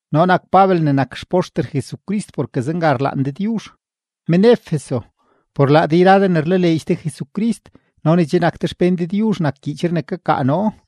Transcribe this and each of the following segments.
Noo nak Pabel ne nak xpoxter Jesucrist porke zenga rlaan Dëdyuzh. Men-Efeso, por laa de yra de ne rlaleedx de Jesucrist no ne che nak de xpén Dëdyuzh nak gyiichree ne kakaa noo.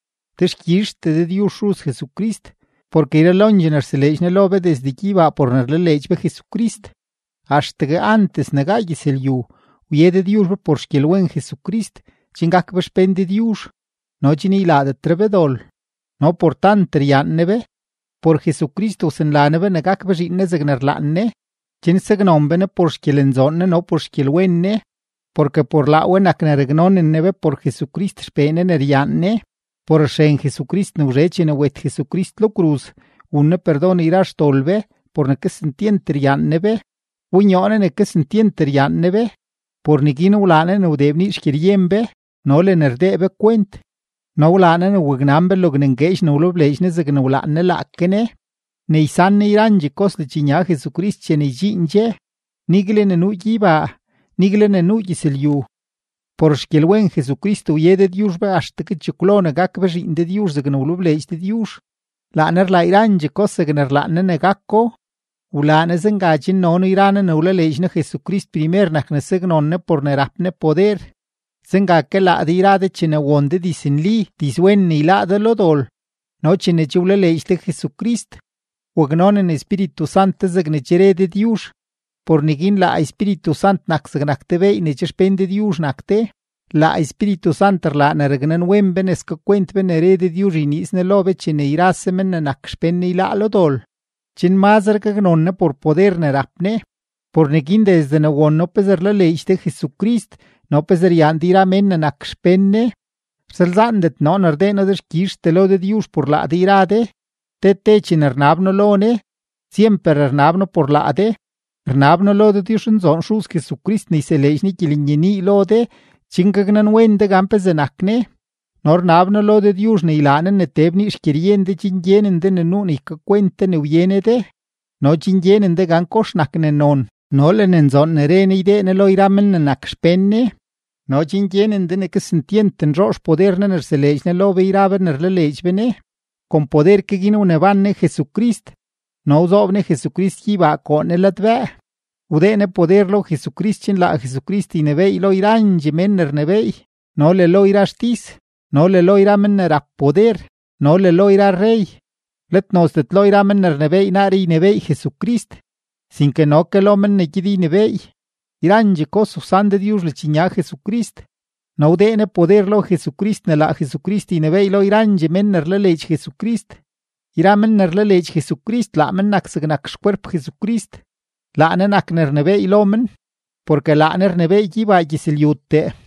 Dexkyizhtee Dëdyuzh Xuz Jesucrist, porke yralondxee ne rseleedx Ne lo be desde gyeybaa por ne rlaleedx be Jesucrist. Axtegue antes ne gaa gyëzlyu, wye Dëdyuzh be por xgyelwen Jesucrist chen gak be xpén Dëdyuzh no chen ylaadetre be dol. No por tant ryaan Ne be, por Jesucrist wsanla Ne be ne gak be zhiin Ne zegne rlaan Ne chen saknon be Ne por xgyelenzoon Ne no por xgyelwen Ne, porke por laa we nak ne raknonen Ne be por Jesucrist XPee Ne ne ryaan Ne. Por xren Jesucrist ne wzhe chene wet Jesucrist lo kruz, wun Ne perdon yra xdol be por ne kesentyent ryaan Ne be. Wbonyoo Ne ne kesentyent ryaan Ne be, por neguin wlaa Ne ne wdee bnii xgyeryen be no le ne rdee be kwent. No wlaa Ne ne waknan be logne ngueedx ne wlebleedx Ne zegne wlaan Ne laake Ne ne ysan Ne yrandxee kos ledxnya Jesucrist chene ydxiin dxe, nigle ne nuu gyeybaa, nigle ne nuu gyëzlyu. Por xgyelwen Jesucrist wye Dëdyuzh be axtegue chekwlo ne gak be zhiin Dëdyuzh zegne wlebleedx Dëdyuzh; laa Ne rlaa yrandxee kos zegne rlaan Ne ne gako. Wlaa Ne zenga chen noo yra noo ne wlaleedx noo Jesucrist primer nak ne saknon Ne por ne rap Ne poder. Zenga ke laa de yra de chene won de diznli, dizwen ne ylaa ne yláá de lo dol no chene che wlaleedx de Jesucrist, waknonen Espíritu Sant de zegne che re Dëdyuzh, por neguin laa Espíritu Sant nak zegnak te beey ne che xpén Dëdyuzh nak de. Laa Espíritu Sant rlaa ne raknanwen be ne skakwent be ne re Dëdyuzh ne yniiz Ne lo be chene yrase men ne nak xpén Ne yláá lo dol, chen mazre gaknon Ne por poder ne rap Ne. Por neguin desde ne won noo pezee rlaleedx de Jesucrist no pezee ryaan de yra mén ne nak xpén Ne, rsalzaandet noo ne rdee noo dexkyizhtee lo Dëdyuzh por laa de yra de, te te chene rnab noo lo Ne, syemper rnab noo por laa de. Rnab noo lo Dëdyuzhnzoon Xuz Jesucrist ne yseleedx Ne gyelenyenii lo de chen gaknanwen de gan pezee nak Ne. No rnab noo lo Dëdyuzh ne ylaa Ne ne tee bnii xgyeryen de chen gyenen de ne nuu ne ykakwent de ne wye Ne de, no chen gyenen de gan kox nak ne non no le ne nzoon ne re Ne ne ydee Ne lo yra men ne nak xpén Ne, no chen gyenen de ne kesentyent nzhoo xpoder Ne ne rseleedx Ne lo be yra be ne rlaleedx be Ne. Kon poder ke guin wneban Ne Jesucrist no wzoob Ne Jesucrist gyeybaa koo Ne ladbëë, wdee Ne poder lo Jesucrist chen laa Jesucrist ynebééy lo yrandxee men ne rnebééy no le lo yra xtis no le lo yra men ne rap poder no le lo yra rrey, let nozdet lo men ne rnebééy naaree ynebééy Jesucrist, sinke no ke lo men ne gyed ynebééy. Yrandxee kos wsan Dëdyuzh ledxnya Jesucrist, no wdee Ne poder lo Jesucrist ne laa Jesucrist ynebééy lo yrandxee men ne rlaleedx Jesucrist. Yra men ne rlaleedx Jesucrist laa men nak zegnak xkwerp Jesucrist. Laa Ne nak ne rnebééy lo men, porke laa Ne rnebééy gyeybaa gyëzlyutee.